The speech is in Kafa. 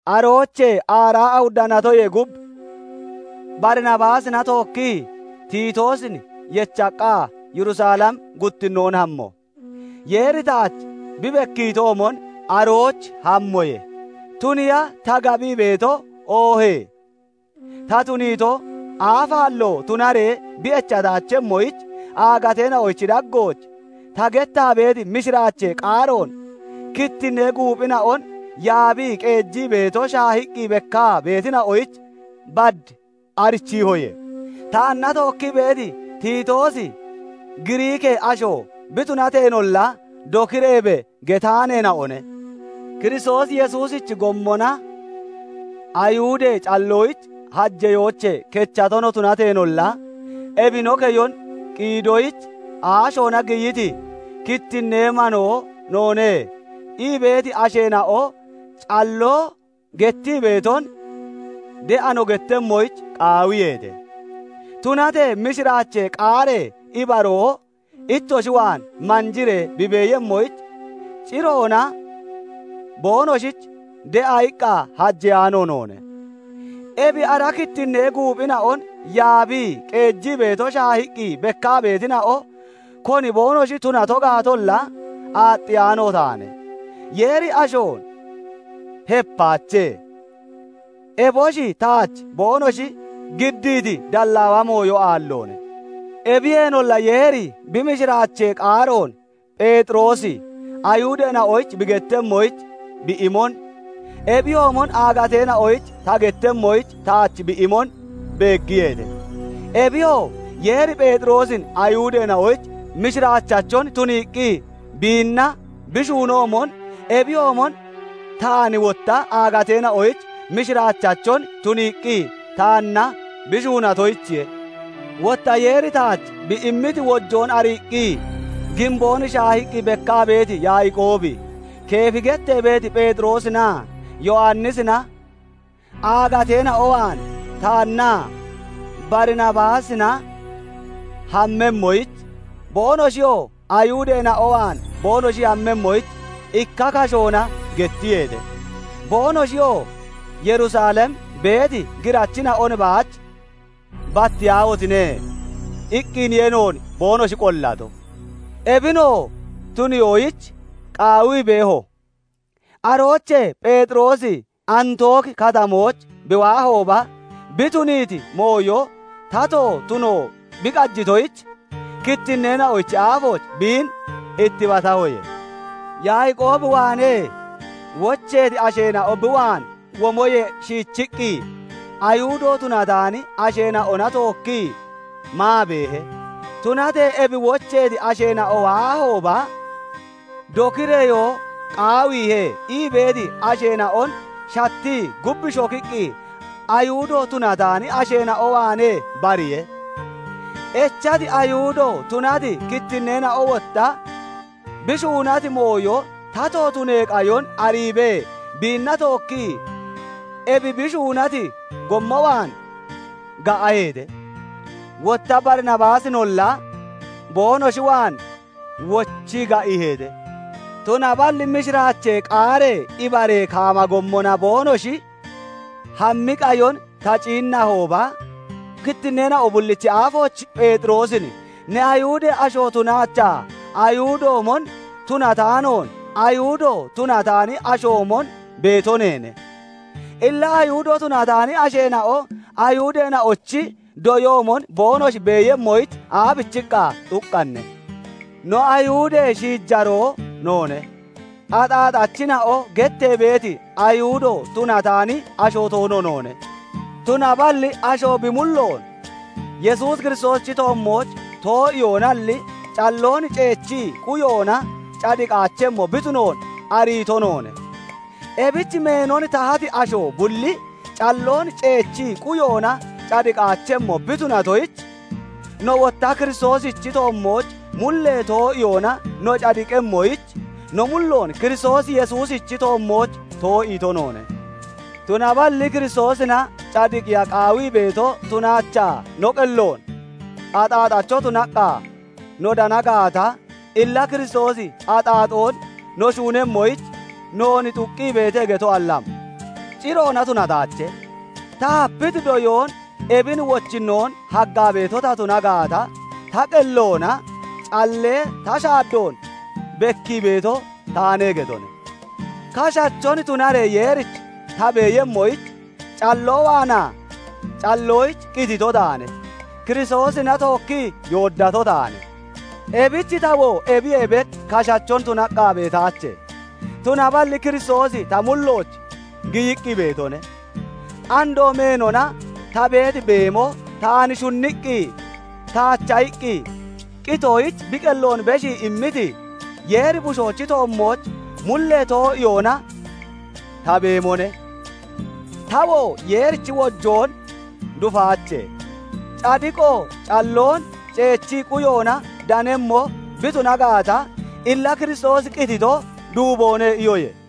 Aroochee aaraa awudda natoyee gub Barinabaasina tookkii Titoosin yechaqqa Yerusalem guttinnoon hamo. Yeeri taach bi bekkiitoomon arooch hammoye; tuniiya ta gabii beeto oohee ta tuniito aafaallo tunaree bi echataachemmoyich, aagateena'ochi daggooch ta gettaa beeti mishiraachee qaaroon kittinnee guuphina'on yaabii qeejii beeto shaahiqqi bekkaa beetina'oyich bad arichiihoye. Taanna tookkii beeti Titoosi Giriikee asho bi tunateenolla, "Dokireebe" getaaneena'one. Kiristoos Yesuusichi gommona Ayihudee calloyich hajeyoochee kechato no tunateenolla, ebi no keyon qiidoyich aashoona giyiti, "Kittinnee manoo noone" ii beeti asheena'o calloo gettii beeton de'a no gettemmoyich qaawiyeete. Tunatee mishiraachee qaaree ibaroo ittoshi waan manjiree bi beeyemmoyich, ciroona boonoshich de'a iqqa hajeyaano noone. Ebi ara kittinnee guuphina'on yaabii qeejii beeto shaahiqqi bekkaa beetina'o, koni boonoshi tunato gaatolla aaxxiyaano taane; Yeeri ashoon hepaache; eboshi taach boonoshi giddiiti dallaawa mooyo aalloone. Ebiyeenolla Yeeri bi mishiraachee qaaroon Pheexiroosi Ayihudeena'oyich bi gettemmoyich bi imon, ebiyoomon aagateena'oyich ta gettemmoyich taach bi imon beeggiyeete. Ebiyoo, Yeeri Pheexiroosin Ayihudeena'oyich mishiraachachon tuniiqqi biinna bi shuunoomon, ebiyoomon taan wotta aagateena'oyich mishiraachachon tuniiqqi taanna bi shuunatoyichiye. Wotta Yeeri taach bi immiti wojoon ariiqqi giimboon shaahiqqi bekkaa beeti Yaaqoobi, Keefi gettee beeti Pheexiroosinaa Yowannisina aagateena'o waan taannaa Barinabaasina hammemmoyich, boonoshiyoo Ayihudeena'o waan boonoshi hammemmoyich ikka kashoona gettiyeete. Boonoshiyoo Yerusalem beeti girachina'on baach battiyaahotine! iqqiniye noon boonoshi qollato. Ebinoo tuniyoyich qaawii beeho. Aroochee Pheexiroosi Antooki Katamooch bi waahooba, bi tuniiti mooyo tato tuno bi qajitoyich, kittinneena'ochi aafooch biin ittibatahoye. Yaaqoob waanee wocheeti asheena'o bi waan womoyee shiichiqqi Ayihudo tunataani asheena'ona tookkii maa beehe; tunatee ebi wocheeti asheena'o waahooba "Dokireyoo qaawiihe" ii beeti asheena'on shattii gub shokiqqi Ayihudo tunataani asheena'o waanee bariye. Echati Ayihudo tunati kittinneena'o wotta bi shuunati mooyo tato tunee qayon ariibee biinna tookkii ebi bi shuunati gommo waan ga'aheete; wotta Barinabaasinolla boonoshi waan wochii ga'iiheete. Tunaballi mishiraachee qaaree ibaree kaama gommona boonoshi hammi qayon ta ciinnahooba, kittinneena'o bullichi aafooch Pheexiroosin "Ne Ayihudee asho tunaachaa, Ayihudoomon tunataanoon Ayihudo tunataani ashoomon beeto neene; illa Ayihudo tunataani asheena'o Ayihudeena'ochi doyoomon boonoshi beeyemmoyich aabichiqqa xuqqanne? "No, Ayihudee shiijaroo noone; 'Axaxachina'o' gettee beeti, Ayihudo tunataani asho toono noone; tunaballi asho bi mulloon Yesuus Kiristoosichi toommooch too'iyoonalli, calloon ceechii quyoona cadiqaachemmo bi tunoon ariito noone. Ebich meenon tahati asho bulli calloon ceechii quyoona cadiqaachemmo bi tunatoyich, no wotta Kiristoosichi toommooch mullee too'iyoona no cadiqemmoyich, no mulloon Kiristoos Yesuusichi toommooch too'iito noone. Tunaballi Kiristoosina cadiqiya qaawii beeto tunaachaa no qelloona axaaxacho tunaqqa no dana gaata, illa Kiristoosi axaaxoon no shuunemmoyich noon xuqqi beete getoalli am? Ciroona tunataache! Ta hapiti doyoon ebin wochinnoon haggaa beeto ta tuna gaata, ta qelloona callee ta shaaddoon bekkii beeto taane getone. "Kashachon tunaree Yeerich ta beeyemmoyich, calloo waanaa calloyich qitito taane. Kiristoosina tookkii yooddato taane; ebich tawoo ebiyee bek kashachon tunaqqa beetaache; tunaballi Kiristoosi ta mullooch giyiqqi beetone. Andoo meenona ta beeti beemo, taan shunniqqi taacha iqqi qitoyich bi qelloon beshii immiti, Yeeri Bushoochi toommooch mullee too'iyoona ta beemone. Tawoo Yeerichi wojoon dufaache; cadiqoo calloon ceechii quyoona danemmo bi tuna gaata, illa Kiristoosi qitito duuboone" iyoye.